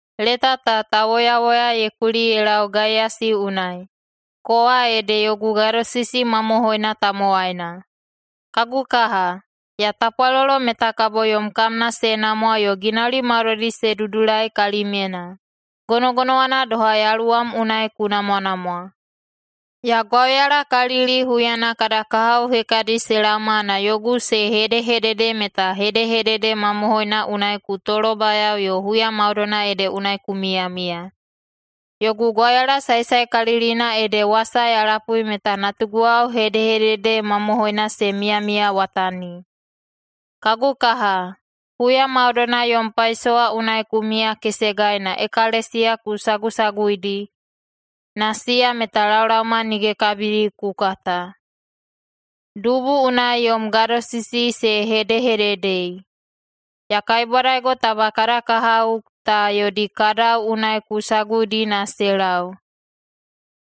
Leta ta tauwoyawoya ye kuli ye lau Gaiyasi unai, kowa ede yogu gadosisi mamohoina tamowaina. Kagu kaha, ya tapwalolo meta kabo yom kamna se namwa yo ginauli maudoidi se dudulai kalimyena, gonogonowana doha yaluwam unai ku namwanamwa. Ya gwauyalakalili huyana kada kahao hekadi se laoma na yogu se hedehedede meta hedehedede mamohoina unai ku tolobayao yo huya maudoina ede unai ku miyamiya. Yogu gwauyala saesaekalilina ede wasa ya lapui meta natuguwao hedehedede mamohoina se miyamiyawatani. Kagu kaha, huya maudoina yom paisowa unai ku miyakesegai na ekalesiya ku sagusaguidi, na siya meta laolaoma nige kabidi ku kata. Dubu unai yom gadosisi se hedehededei. Ya kaibwadaigo taba kada kahao ta yodi kadau unai ku saguidi na se lau,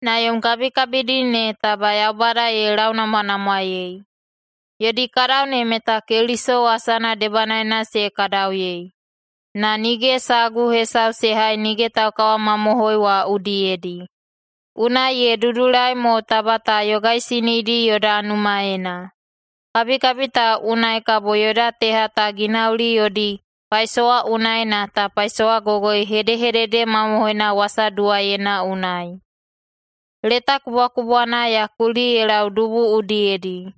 na yom kabikabidi ne taba Yaubada ye launamwanamwaei. Yodi kadau ne meta Keliso wasana debanaena se kadauyei, na nige sagu hesau se hai nige taukawamamohoi wa udiyedi. Unai ye dudulai mo taba ta yogaisinidi yoda numaena. Kabikabi ta unai kabo yoda teha ta ginauli yodi paisowa unai na ta paisowagogoi hedehedede mamohoina wasaduwaiyeina unai. Leta kubwakubwana ya kuli ye lau dubu udiyedi,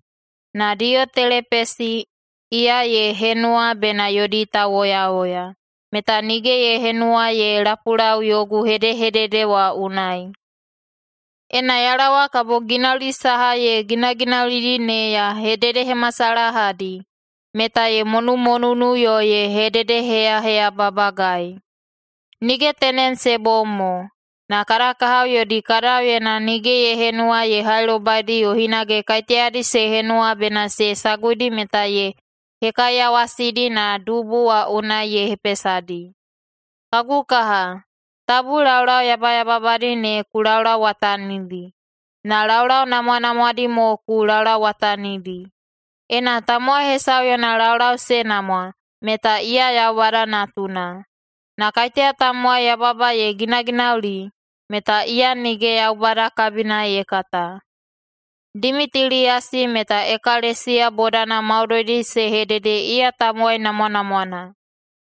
na Diyotelepesi, iya ye henuwa bena yodi tauwoyawoya, meta nige ye henuwa ye lapulau yogu hedehedede wa unai. Ena ya laowa kabo ginauli saha ye ginaginaulidi ne ya hededehemasalahadi, meta ye monumonunu yo ye hededeheyaheyababagai. Nige tenem se bom mo, na kada kahao yodi kadauyena nige ye henuwa ye hailobaidi yo hinage kaiteyadi se henuwa bena se saguidi meta ye hekaiyawasidi na dubu wa unai ye hepesadi. Kagu kaha, tabu laulau yabayababadi ne ku laulauwatanidi, na laulau namwanamwadi mo ku laulauwatanidi. Ena tamowai hesau yona laulau se namwa, meta iya Yaubada natuna. Na kaiteya tamowai yababa ye ginaginauli, meta iya nige Yaubada kabina ye kata. Dimitiliyasi meta ekalesiya bodana maudoidi se hedede iya tamowai namwanamwana.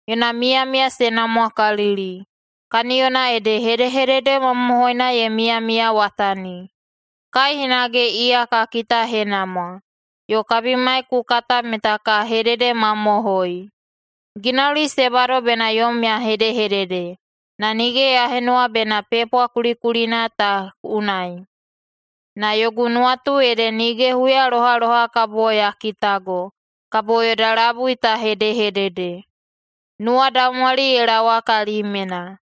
Yona miyamiya se namwakalili, kaniyona ede hedehedede mamohoina ye miyamiyawatani. Kai hinage iya ka kitahenamwa, yo kabimai ku kata meta ka hededemamohoi. Ginauli se bado bena yom ya hedehedede, na nige ya henuwa bena pepwa kulikulina ta unai. Na yogu nuwatu ede nige huyalohaloha kabo ya kitago, kabo yoda labui ta hedehedede. Nuwadaumwali ye laowa kalimyena!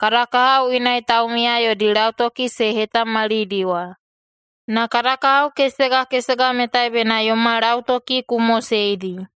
Kada kahao inai taumiya yodi lautoki se hetamalidiwa. Na kada kahao kesega kesega metai bena yoma lautoki ku moseidi.